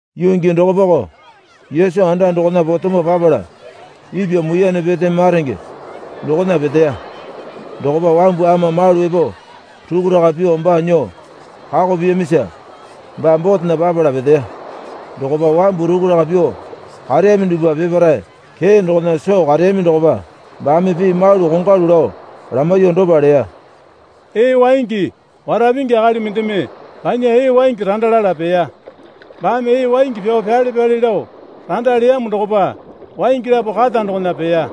Yuu gii dokopako Yesu anda dokona potemo papala ipwa muiyane pete maronge dokona peteya. Dokopa wambu ama malu epo rukuraka pyuo baa nyuo kako piyamisa baa botena papala peteya. Dokopa wambu rukuraka pyuo kareyami dupwa peparae kee dokona soo kareyami dokopa baame pii malu kongwalu lao lamaiyuo dopa leya. Ee waingi wara pingi akali mendeme banya ee waingi randa lala peya. Baame ee waingi pyao pyale pyale lao randa leyamo dokopa waingi lapo kata dokona peya.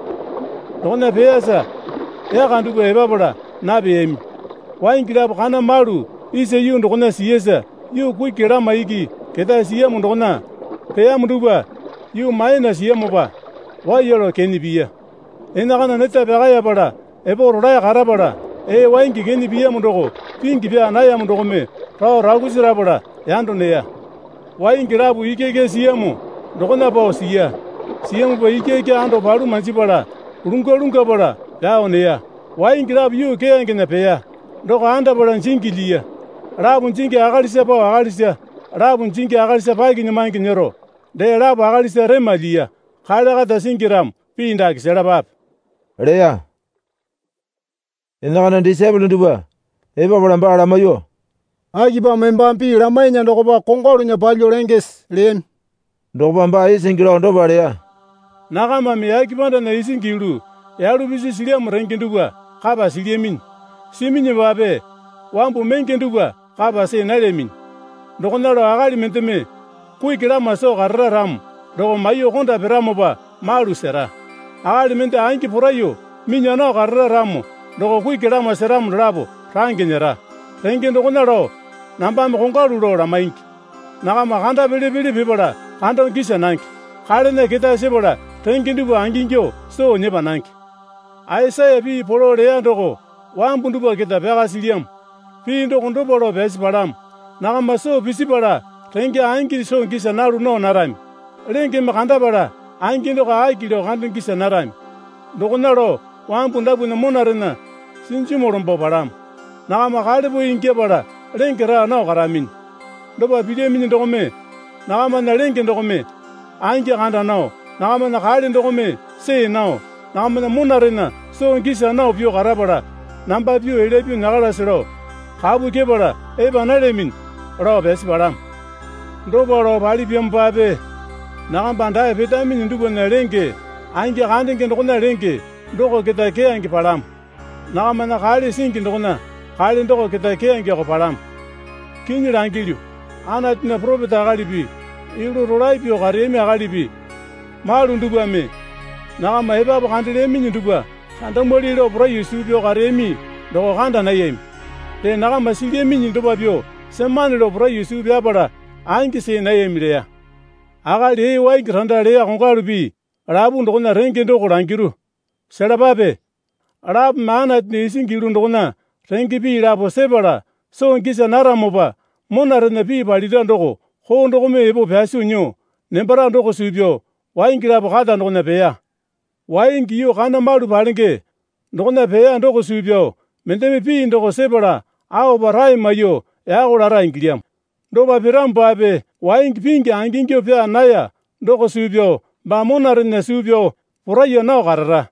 Dokona peyasa yaka dupwa epapala napeyami. Waingi lapo kana malu isa yuu dokona siyasa yuu kuki lama iki ketae siyamo dokona peyamo dupwa yuu maena siyamopa waiya lao kene piya. Enakana neta pyakaeyapala epo rolae karapala ee waingi kene piyamo doko pingi pyaa nayamo dokome rao rakusi rapala yando neya. Waingi lapo ikyaikya siyamo dokona pao siya. Siyamopa ikyaikya ando palu manjipala lungwa lungwapala pyao neya. Waingi lapo yuu keyangena peya. Doko andapala jingi lyiya. Lapo jingi akalisa pao akalisa lapo jingi akalisa pakinyamange nyero, dee lapo akalisa rema lyiya. Kale kata singi ramo pii dake selapape, leya. Enakana disaepole dupwa epapala baa lamaiyuo, Akipamo embame pii lamainya dokopa kongwalunya palyuo lengese? leyami. Dokopa baa isingi lao dopa leya. Nakamame yake pandana isingi yulu yalu pisi silyamo renge dupwa kapa silyaminyi. Siminyipape wambu menge dupwa kapa see nalyaminyi. Dokona lao akali mendeme kuki lama soo karara ramo doko maiyuo konda piramopa malu sera. Akali mende angi poraiyuo minya nao karara ramo doko kuki lama seramo dolapo range nyera. Renge dokona lao nambame kongwalu lao lamaingi. Nakama kanda pele pele pipala kando gisa nange. Kalena ketae sepala renge dupwa angingyuo soo nyepa nange. Aisaya pii polo leya doko wambu dupwa keta pyaka silyamo. Pii doko dopa lao pyasi palamo. Nakama soo pisipala renge angi soo gisa nalu nao narami. Lengeme kandapala angi doko aki lao kando gisa narami. Dokona lao wambu dapwana monarena sinjimu lombo palamo. Nakama kalepoe ingyapala lenge raa nao karaminyi. Dopa pilyaminyi dokome nakamana lenge dokome angi kanda nao, nakamana kale dokome see nao, nakamana monarena soo gisa nao pyuo karapala namba pyuo elya pyuo nyakalase lao kapu kyepala epa nalyaminyi, lao pyasi palamo. Dopa lao palipyamopape nakamba dae petaminyi dupwana lenge angi kandenge dokona lenge doko keta keyange palamo. Nakamana kale singi dokona kale doko keta keyangeko palamo. Kinyi langilyu, Anatunya poropeta akalipi yulu rolae pyuo kareyami akalipi malu dupwame nakama epapu kandelyaminyi dupwa kandamwali lao poraiyuo suu pyao kareyami doko kanda nayami. Dee, nakama silyaminyi dopa pyuo semane lao poraiyuo suu pyapala angi see nayami leya. Akali ee waingi randa leya kongwalu pii lapu dokona renge doko langiru, selapape. Lapome Anatunya isingi yulu dokona renge pii lapo sepala soo gisa naramopa monarena pii palira doko koo dokome epo pyaso nyuo nembara doko suu pyao waingi lapo kata dokona peya. Waingi yuu kana malu palenge dokona peya doko suu pyao mendeme pii doko sepala aopa rae maiyuo yako lara ingilyamo. Dopa piramopape waingi pingi angingyuo pyaa naya doko suu pyao baa monarena suu pyao poraiya nao karara.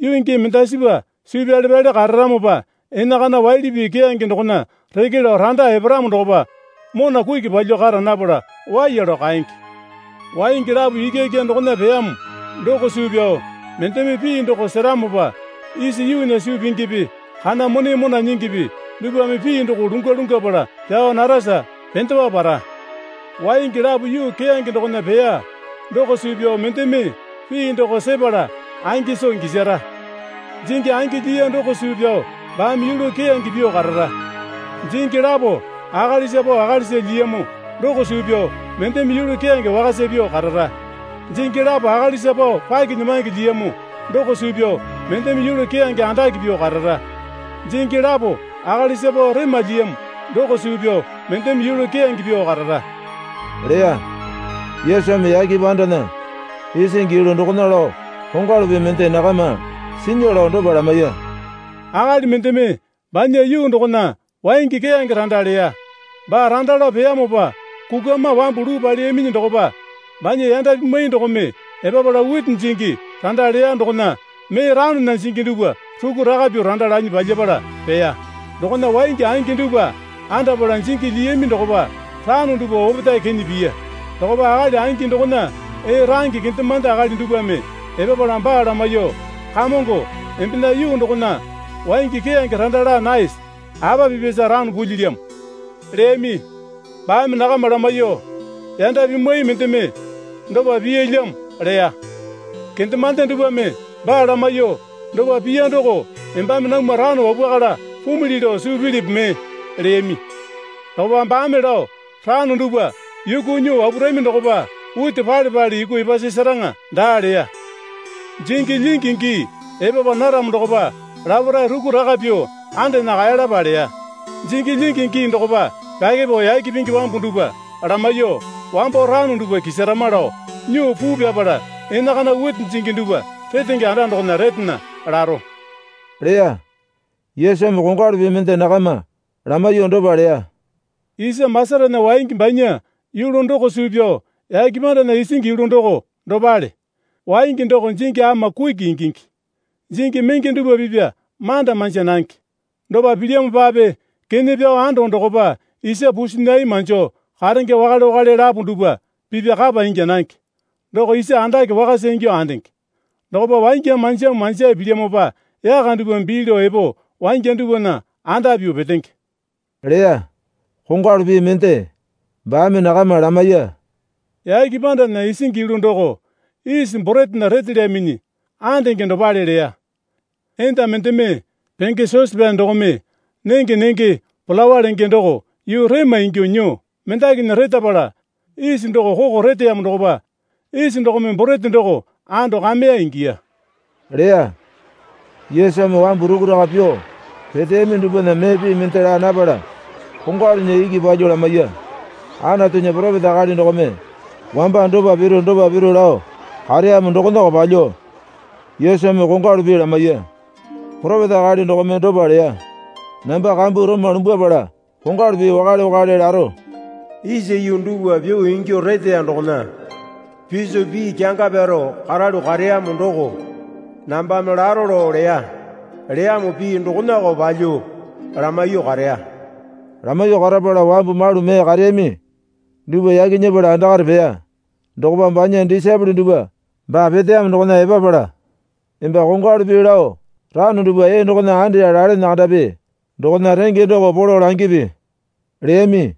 Yuu gii mendasipa suu pyale pyale kararamopa, enakana waili pii keyange dokona reke lao randa eparamo dokopa mona kuki palyuo kara napala waiya lao kaenge. Waingi lapo ikyaikya dokona peyamo doko suu pyao mendeme pii doko seramopa isa yuunya suu pingipi kana mone mona nyingipi dupwame pii doko lungwa lungwapala pyao narasa pendewa para. Waingi lapo yuu keyange dokona peya doko suu pyao mendeme pii doko sepala angi soo gisara. Jingi angi lyiya doko suu pyao baame yulu keyange pyuo karara. Jingi lapo akalisa pao akalisa lyiyamo doko suu pyao mendeme yulu keyange wakasa pyuo karara. Jingi lapo akalisa pao pakinyamange lyiyamo doko suu pyao mendeme yulu keyange andake pyuo karara. Jingi lapo akalisa pao rema lyiyamo doko suu pyao mendeme yulu keyange pyuo karara, leya. Yesumi yake pandana isingi yulu dokona lao kongwalu pii mende nakama sinya lao dopa lamaiya. Akali mendeme banya yuu dokona waingi keyange randa leya. Baa randa lao peyamopa kukwama wambu luu paleyaminyi dokopa banya yanda pimwai dokome epapala witi jingi randa leya dokona mee ranona jingi dupwa rukuraka pyuo randa lanyi palyapala peya. Dokona waingi angi dupwa andapala jingi lyiyami dokopa rano dupwa opetae kene piya. Dokopa akali angi dokona ee range kendemande akali dupwame epapala baa lamaiyuo, Kamongo, embena yuu dokona waingi keyange randa laa naese? Apa pipyasa rano pulyilyamo? leyami. Baame nakama lamaiyuo, Yanda pimwai mendeme dopa piyalyamo, leya. Kendemande dupwame baa lamaiyuo, Dopa piya doko embame namwa rano wapwakala pumili lao suu pilipi mee? leyami. Dokopa baame lao, Rano dupwa yuku nyuo wapwarami dokopa witi pale pale yuku epasasaraŋa daa leya. Jingi lyingi gii epapa naramo dokopa laparae rukuraka pyuo andena kaeyalapa leya. Jingi lyingi gii dokopa pyakepao yake pingi wambu dupwa lamaiyuo, Wambo rano dupwa kisarama lao nyuo puu pyapala enakana witi jingi dupwa retenge anda dokona retena, laro, leya. Yesumi kongwalu pii mende nakama lamaiyuo dopa leya. Isa masatana waingi banya yulu doko suu pyao yake pandana isingi yulu doko dopale. Waingi doko jingi ama kuki ingingi. Jingi menge dupwa pipya manda manja nange. Dopa pilyamopape kene pyao ando dokopa isa pusinai manjo karenge wakale wakale lapo dupwa pipa kapa ingya nange. Doko isa andake wakasa ingyuo andenge. Dokopa wangya manjamu manjae pilyamopa yaka dupwa bii lao epo wangya dupwana anda pyuo petenge, leya. Kongwalu pii mende baame nakama lamaiya. Yake pandana isingi yulu doko isi boretena retelyaminyi andenge dopale leya. Enda mendeme penge sosepyane dokome nenge nenge palawa lenge doko yuu rema ingyuo nyuo mendakinya retapala isi doko koko reteyamo dokopa isi dokome borete doko ando kameya ingiya, leya. Yesumi wambu rukuraka pyuo peteyami dupwana mee pii mende laa napala kongwalunya iki palyuo lamaiya. Anatunya poropeta akali dokome wamba dopa piru dopa piru lao kareyamo dokonako palyuo Yesumi kongwalu pii lamaiya. Poropeta akali dokome dopa leya. Namba kambu roma lumbwapala kongwalu pii wakale wakale laro, isa yuu dupwa pyuo ingyuo reteya dokona piso pii kyanga pyaro karalu kareyamo doko nambame laro lao leya. Leyamo pii dokonako palyuo lamaiyuo kareya. Lamaiyuo karapala wambu malu mee kareyami dupwa yaki nyepala andakare peya. Dokopa banya disaepole dupwa baa peteyamo dokona epapala, Emba kongwalu pii lao rano dupwa ee dokona andeya lalene kandapi dokona renge doko polo langipi, leyami.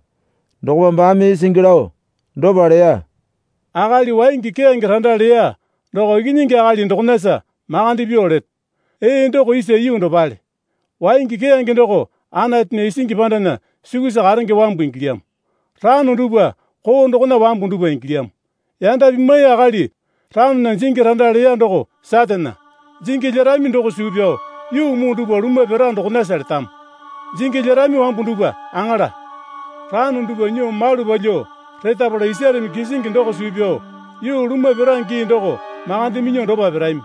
Dokopa baame isingi lao dopa leya. Akali waingi keyange randa leya doko Ikinyingi Akali dokonasa makande pyuo leto. Ee doko isa yuu dopale. Waingi keyange doko Anatunya isingi pandana sukusa karenge wambu ingilyamo. Rano dupwa koo dokona wambu dupwa ingilyamo. Yanda pimwai akali ranona jingi randa leya doko Satane. Jingi lyerami doko suu pyao yuu muu dupwa lumwa pira dokonasa letamo. Jingi lyerami wambu dupwa aŋala. Rano dupwa nyuo malu palyuo retapala isareme kisingi doko suu pyao yuu lumwa pira gii doko makande minyuo dopa pirami.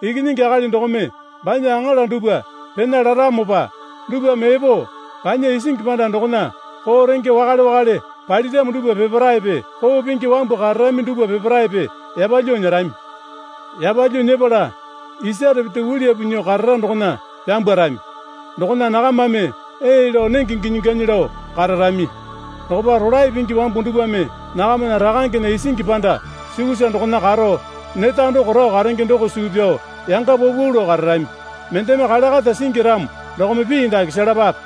Ikinyingi Akali dokome banya aŋala dupwa pena laramopa dupwame epo banya isingi panda dokona koo renge wakale wakale paliramo dupwa peparaepe koo pingi wambu kararami dupwa peparaepe yapalyuo nyerami. Yapalyuo nyepala isare pete uliyapu nyuo karara dokona pyambwarami. Dokona nakamame ee lao nenge ginyi ganyi lao kararami. Dokopa rolae pingi wambu dupwame nakamana Rakangena isingi panda sukusa dokona karo neta doko rao karenge doko suu pyao yanga paupau lao kararami. Mendeme kale kata singi ramo dokome pii dake selapape.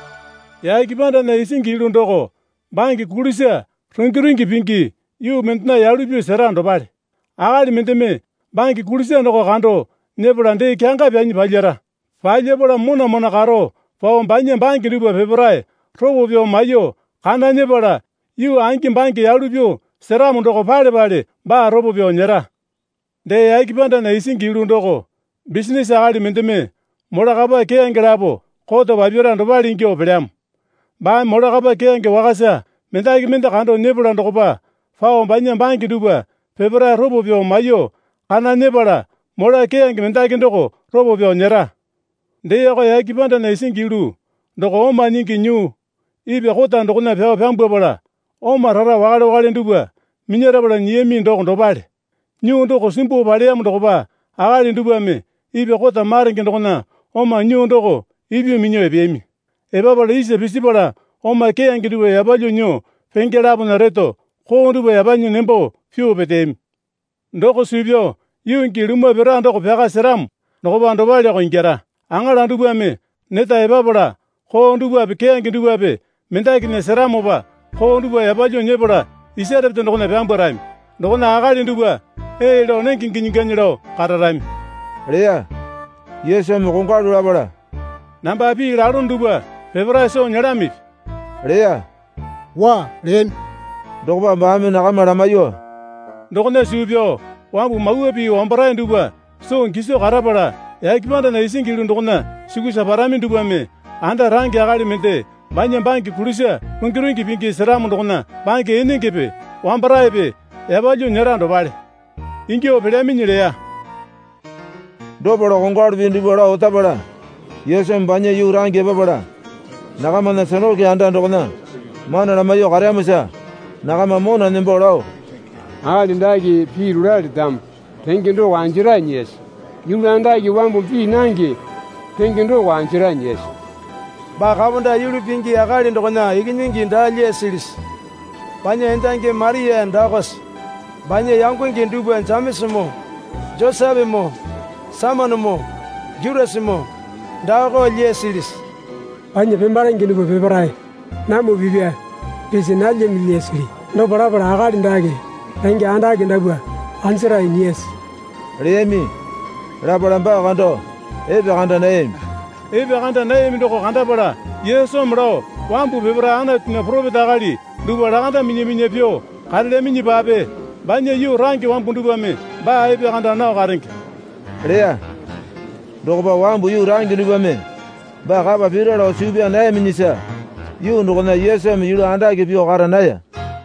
Yake pandana isingi yulu doko bange kulisa rungi rungi pingi yuu mendena yalu pyuo sera dopale. Akali mendeme bange kulisa doko kando nyepala dee kyanga pyanyi palyara. Palyapala mona mona karo pao banya bange dupwa peparae ropo pyao maiyuo kana nyepala yuu angi bange yalu pyuo seramo doko pale pale baa ropo pyao nyera. Dee yake pandana isingi yulu doko bisinase akali mendeme mola kapa keyange lapo koto papyara dopale ingyuo pelyamo. Baame mola kapa keyange wakasa mendaki mende kando nyepala dokopa pao banya bange dupwa peparae ropo pyao maiyuo kana nyepala mola keyange mendaki doko ropo pyao nyera. Deeko, yake pandana isingi yulu doko oma nyingi nyuu ipwa kota dokona pyao pyambwapala oma rara wakale wakale dupwa minyarapala nyiyami doko dopale. Nyuu doko simbuo paleyamo dokopa akali dupwame ipwa kota marenge dokona oma nyuu doko ipyuo minyuo epeyami. Epapala isa pisipala oma keyange dupwa yapalyuo nyuo penge lapona reto koo dupwa yapanyi nembo pyuo peteyami. Doko suu pyao yuu gii lumwa pira doko pyaka seramo dokopa dopaleko ingyara. Aŋala dupwame neta epapala koo dupwape keyange dupwape mendakinya seramopa koo dupwa yapalyuo nyepala isare pete dokona pyambwarami. Dokona akali dupwa ee lao nenge ginyi ganyi lao kararami, leya. Yesumi kongwalu lapala, Namba pii lalono dupwa peparae soo nyelamipi? leya. Waa, leyami. Dokopa baame nakama lamaiyuo, Dokona suu pyao wambu Mawa Pii wambarae dupwa soo giso karapala yake pandana isingi yulu dokona sukusa parami dupwame, anda range akali mende banya bange kulisa rungi rungi pingi seramo dokona bange enengepe wambaraepe yapalyuo nyera dopale, ingyuo pelyaminyi leya. Dopa lao kongwalu pii dupwa lao otapala, Yesumi banya yuu range epapala nakamana sinakoke anda dokona mana lamaiyuo kareyamosa nakama mona nembo lao, Akali dake pii rolae letamo renge doko anjarae nyiyase? Yulu andake wambumi pii nange renge doko anjarae nyiyase? Baa kaponda yulu pingi akali dokona ikinyingi daa lyasilisi? Banya endangi Maria daakose? Banya yangonge dupwa Jemesamoo Josepemoo Saimonenoo Jutasamoo daako lyasilisi? Banya pemalenge dupwa peparae namwa pipya pisi nalyami lyasili? Dopa lapala akali dake renge andake dapwa anjarae nyiyase? leyami. Lapala baa kando epekanda nayami. Epekanda nayami doko kandapala Yesumi lao wambu peparae Anatunya poropeta akali dupwa lakanda minya minya pyuo karelyaminyipape banya yuu range wambu dupwame baa epekanda nao karenge leya. Dokopa wambu yuu range dupwame baa kapa pira lao suu pyaa nayaminyisa yuu dokona Yesumi yulu andake pyuo kara naya.